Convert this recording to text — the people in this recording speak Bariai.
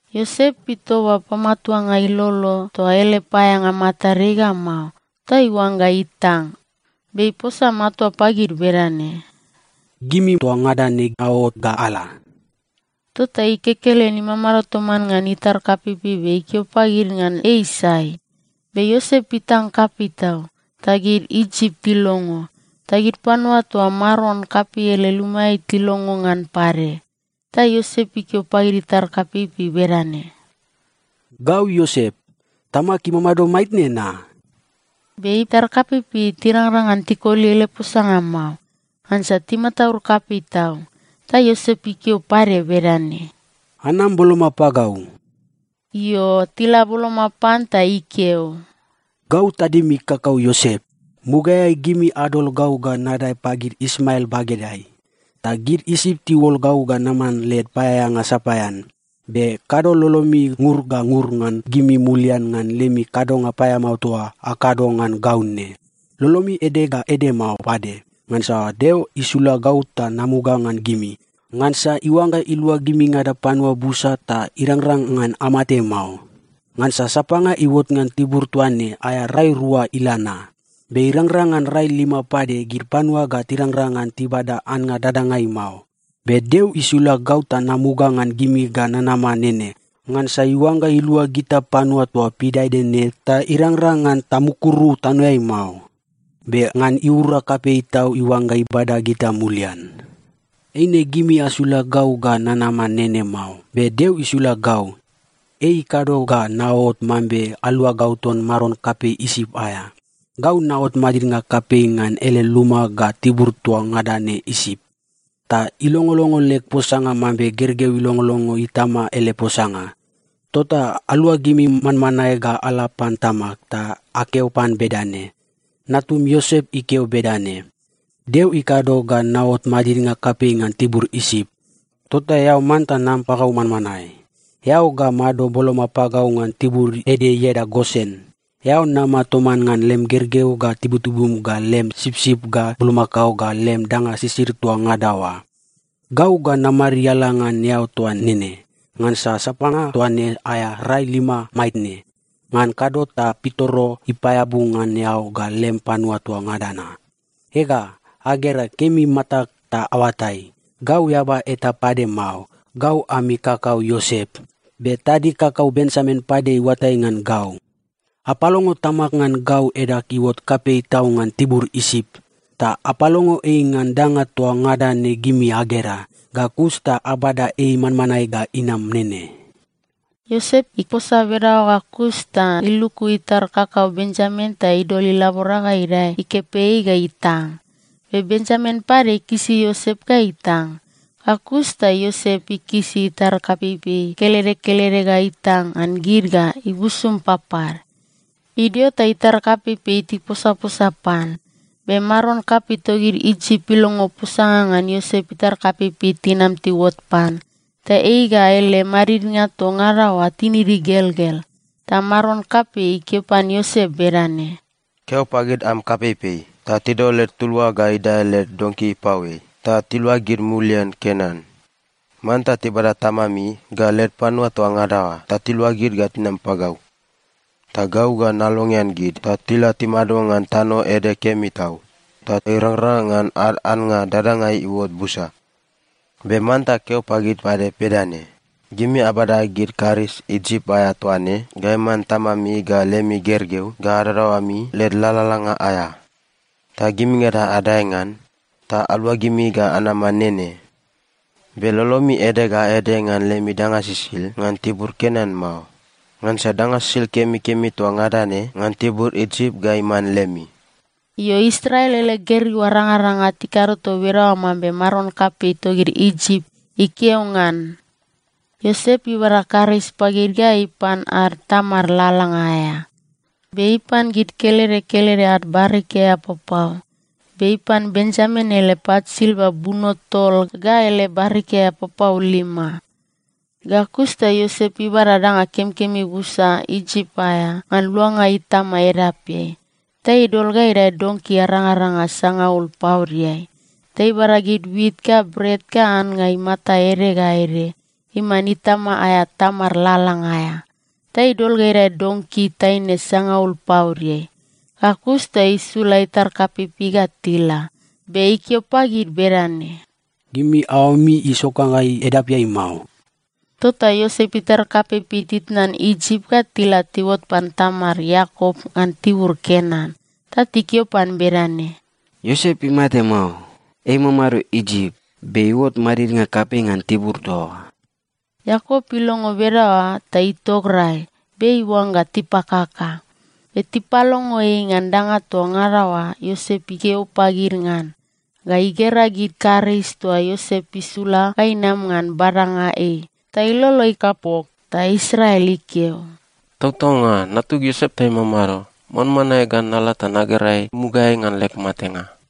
Iosep itoba pamatuanga ilolo toa ele paeaeanga matadeai ga mao, ta iuangga itang. Be iposa matua pagid bedane, “Gimi toa ngada ne aot ga ala.” Tota ei kekelen imamado toman ngan itar kapeipei be ikeo pagid ngan ei sai. Be Iosep itang kapei tau, ta gid Isip tilongo. Ta gid panua toa maron kapei ele lumaeai tilongo ngan pade. Ta Iosep ikeo pagid itar kapeipei bedane, “Gau Iosep. Tamag imamado maitne na?” Be itar kapeipei tirangrang ngan tikoli ele posanga mao, ngansa timataud kapei tau. Ta Iosep ikeo pade bedane, “Anam boloma pagau.” Io, tila boloma pan ta ikeo, “Gau tadimi kakau Iosep. Mugaeai gimi adol gau ga nadae pagid Ismael bagedeai, ta gid Isip tiuol gau ga naman led paeaeanga sapaean. Be kado lolomi ngur ga ngur ngan gimi mulian ngan lemi kadonga paeamao toa akado ngan gau ne. Lolomi ede ga ede mao pade, ngansa Deo isula gau ta namuga ngan gimi, ngansa iuangga ilua gimingada panua busa ta irangrang ngan amate mao. Ngansa sapanga iuot ngan tibur toa ne, aea rai rua ila na. Be irangrang ngan rai lima pade, gid panua ga tirangrang ngan tibada annga dadangai mao. Be Deo isula gau ta namuga ngan gimi ga nanama nene, ngansa iuangga ilua gita panua toa pidaede ne ta irangrang ngan tamukuru tanoeai mao. Be ngan iura kapei tau iuangga ibada gita mulian. “Eine gimi asula gau ga nanama nene mao, be Deo isula gau. Ei ikado ga naot mambe aluagau ton maron kapei Isip aea. Gau naot madidnga kapei ngan ele luma ga tibur toa ngada ne Isip. Ta ilongolongo leg posanga mambe gergeu ilongolongo itama ele posanga. Tota aluagimi manmanae ga ala pan tamag, ta akeo pan bedane, ‘Natum Iosep ikeo bedane: Deo ikado ga naot madidnga kapei ngan tibur Isip. Tota eao manta nam pagau manmanae. Eao ga mado boloma pagau ngan tibur ede ieda Gosen. Eao nama toman ngan lem gergeu ga tibutibum ga lem sipsip ga bulmakao ga lem danga sisid toa ngada oa. Gau ga namariala ngan eao toa nene, ngansa sapanga toa ne aea rai lima maitne. Ngan kado ta pitoro ipaeabu ngan eao ga lem panua toa ngada na.’ “Ega, agera kemi matag ta aoatai, gau eaba eta pade mao, gau ami kakau Iosep. Be tadig kakau Benjamin pade iuatai ngan gau. Apalongo tamag ngan gau edag iuot kapei tau ngan tibur Isip, ta apalongo ei ngan danga toa ngada ne gimi agera. Ga kus ta abada ei manmanae ga inama nene.” Iosep iposa bedaoa ga kus ta iluku itar kakau Benjamin ta idol ilabora ga idae ikepeai ga itang. Be Benjamin pade ikisi Iosep ga itang. Ga kus ta Iosep ikisi itar kapeipei kelede kelede ga itang ngan gid ga ibusum papad. Idio ta itar kapeipei tiposaposa pan. Be maron kapei togid Isip ilongo posanga ngan Iosep itar kapeipei tinam tiuot pan, ta ei ga ele madidnga toa ngada oa tinid igelgel. Ta maron kapei ikeo pan Iosep bedane, “Keo pagid am kapeipei ta tidol led tulua ga idae led donki ipaoeai, ta tiluagid mulian Kenan. Manta tibada tamami ga led panua toa ngada oa ta tiluagid ga tinam pagau. Ta gau ga nalongean gid ta tila timado ngan tano ede kemi tau, ta irangrang ngan ad annga dadangai iuot busa. “Be manta keo pagid pade bedane, ‘Gimi abada gid karis Isip aea toa ne ga iman tamami ga lemi gergeu ga adadaoami led lalalanga aea. Ta gimingada adae ngan ta aluagimi ga anama nene. Be lolomi ede ga ede ngan lemi danga sisid ngan tibur Kenan mao, ngansa danga sisid kemikemi toa ngada ne ngan tibur Isip ga iman lemi.’” Io, Israel ele gergeu arangaranga tikado toa bedaoa mambe maron kapei togid Isip ikeo ngan. Iosep ibada karis pagid ga ipan ad tamad lalalanga aea. Be ipan gid kelede kelede ad barikia papau, be ipan Benjamin ele pat silva buno tol ga ele barikia papau lima. Ga kus ta Iosep ibada danga kemikemi busa Isip aea ngan luanga itama edapeai, ta idol ga idae donki arangaranga sangaul paodeai, ta ibada gid wit ga bret ga annga imata ede ga ede iman itama aea tamad lalalanga aea ta idol ga idae donki taine sangaul paodeai. Ga kus ta isula itar kapeipei ga tila, be ikeo pagid bedane, “Gimi aoami isokangai edapeai mao.” Tota Iosep itar kapeipei titnan Isip ga tila tiuot pan tamad Iakop ngan tibur Kenan. Ta tikeo pan bedane, “Iosep imate mao! Ei imamado Isip be iuot madidnga kapei ngan tibur toa oa!” Iakop ilongo bedaoa ta itograi, be iuangga tipakaka. Be tipalongo ei ngan danga toa ngada oa Iosep ikeo pagid ngan, ga igera gid karis toa Iosep isula ga inam ngan badanga ei, ta ilolo ikapok. Ta Israel ikeo, “Tautaunga. Natug Iosep ta imamado! Manmanae ga nala ta nagera ei mugaeai ngan leg matenga.”